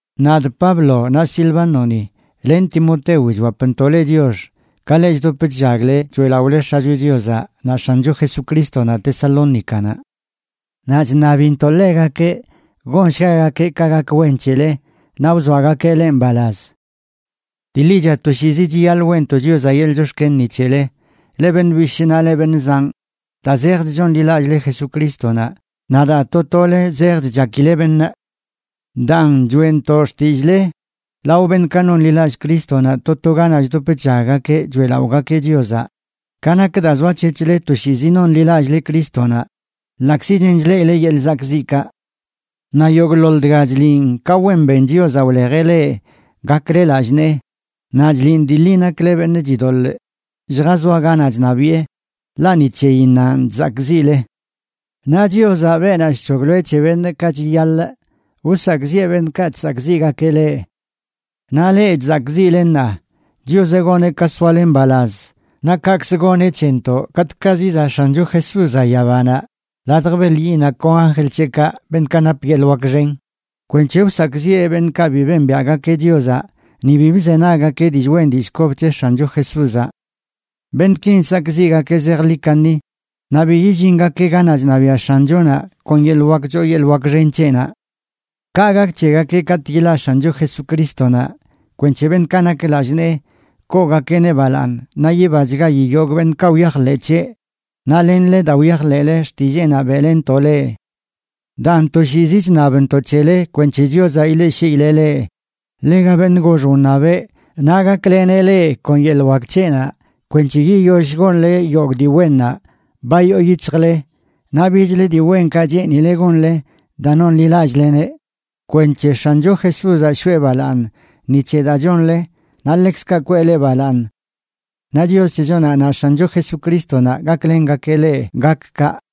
Nadꞌ Pablo, naꞌ Silvánoni len Timotewi chwapntoꞌ leꞌ chiox, ka leꞌ chdop chllagle choeꞌlaꞌole X̱acho Chiozaꞌ naꞌ X̱ancho Jesucrístonaꞌ Tesalónicanaꞌ. Naꞌ chṉabintoꞌ ḻegakeꞌ gonshgagakeꞌ ka gak wen c̱hele naꞌ wzoagakeꞌ leꞌ mbalaz. Dii ḻicha toshiizi chiyaḻꞌ weꞌntoꞌ Chiozaꞌ yeḻꞌ chox̱ken ni c̱hele, leꞌ beṉꞌ bishꞌ naꞌ leꞌ beṉꞌ zanꞌ, daa zejch chonḻilallꞌle Jesucrístonaꞌ naꞌ daa to tole zejch chakile beṉꞌ. Daan, choeꞌntoꞌ xtillꞌle lao beṉꞌkaꞌ nonḻilallꞌ Crístonaꞌ to to ganaꞌ chdop chllaggakeꞌ choeꞌlaꞌogakeꞌ Chiozaꞌ ka nak daa zoac̱hec̱hle toshiizi noṉlilallꞌle Crístonaꞌ ḻaꞌkzi chen chleꞌile yeḻꞌ zakꞌziꞌkaꞌ. Naꞌ yogꞌḻoḻ dga chliꞌn ka wen ben Chiozaꞌ wlejeꞌ leꞌ gakle lallꞌ nee, naꞌ chliꞌn dii ḻi nakle beṉꞌ chidoḻꞌ lljazoa ganaꞌ chṉabiꞌe, ḻaꞌ ni c̱heyinnanꞌ chzakꞌziꞌle. Naꞌ Chiozaꞌ, beenaꞌ chc̱hoglo c̱he beṉꞌ ka chiyaḻꞌ, wsakꞌziꞌe beṉꞌkaꞌ chsakꞌziꞌgakeꞌ leꞌ. Naꞌ leꞌ chzakꞌziꞌle ṉaa, Chiozaꞌ goneꞌ ka soale mbalaz, naꞌ kaꞌkz goneꞌ c̱hentoꞌ katꞌkaꞌ zizaꞌ X̱ancho Jesúzaꞌ yabanaꞌ ladj beḻ yiꞌnaꞌ kon anjl c̱heꞌkaꞌ, beṉꞌkaꞌ nap yeḻꞌ wak xen, kwenc̱he wsakꞌziꞌe beṉꞌkaꞌ bi bembiaꞌgakeꞌ Chiozaꞌ ni bi bzenaggakeꞌ dillꞌ wen dillꞌ kob c̱he X̱ancho Jesúzaꞌ. Beṉꞌkin sakziꞌgakeꞌ zejḻi kaṉi naꞌ bi yillingakeꞌ ganaꞌ chṉabiaꞌ X̱anchonaꞌ kon yeḻꞌ wak choo yeḻꞌ wak xen c̱heꞌnaꞌ. Kaꞌ gak c̱hegakeꞌ katꞌ yilaꞌ X̱ancho Jesucrístonaꞌ kwenc̱he beṉꞌkaꞌ nak lallꞌ nee koogakeꞌneꞌ balaaṉ naꞌ yibachgayi yogꞌ beṉꞌkaꞌ wyajḻeꞌ c̱heꞌ, naꞌ lenle, daa wyajḻeꞌle xtilleenaꞌ beꞌlentoꞌ leꞌ. Daan, toshiizi chṉabntoꞌ c̱hele kwenc̱he Chiozaꞌ ileꞌshiileꞌ leꞌ ḻega beṉꞌ gox wṉabeꞌ, naꞌ gakleneꞌ leꞌ kon yeḻꞌ wak c̱heꞌnaꞌ kwenc̱he yiyoll gonle yogꞌ dii wennaꞌ ba yoo yic̱hjle naꞌ bichlə dii wenkaꞌ cheenileꞌ gonle daa nonḻilallꞌleneꞌ kwenc̱he X̱ancho Jesúzaꞌ shoꞌe balaaṉ ni c̱he daa chonle, naꞌ ḻekzkaꞌ kwee leꞌ balaaṉ. Naꞌ Chios c̱hechonaꞌ naꞌ X̱ancho Jesucrístonaꞌ gaklengakeꞌ leꞌ gak kaꞌ.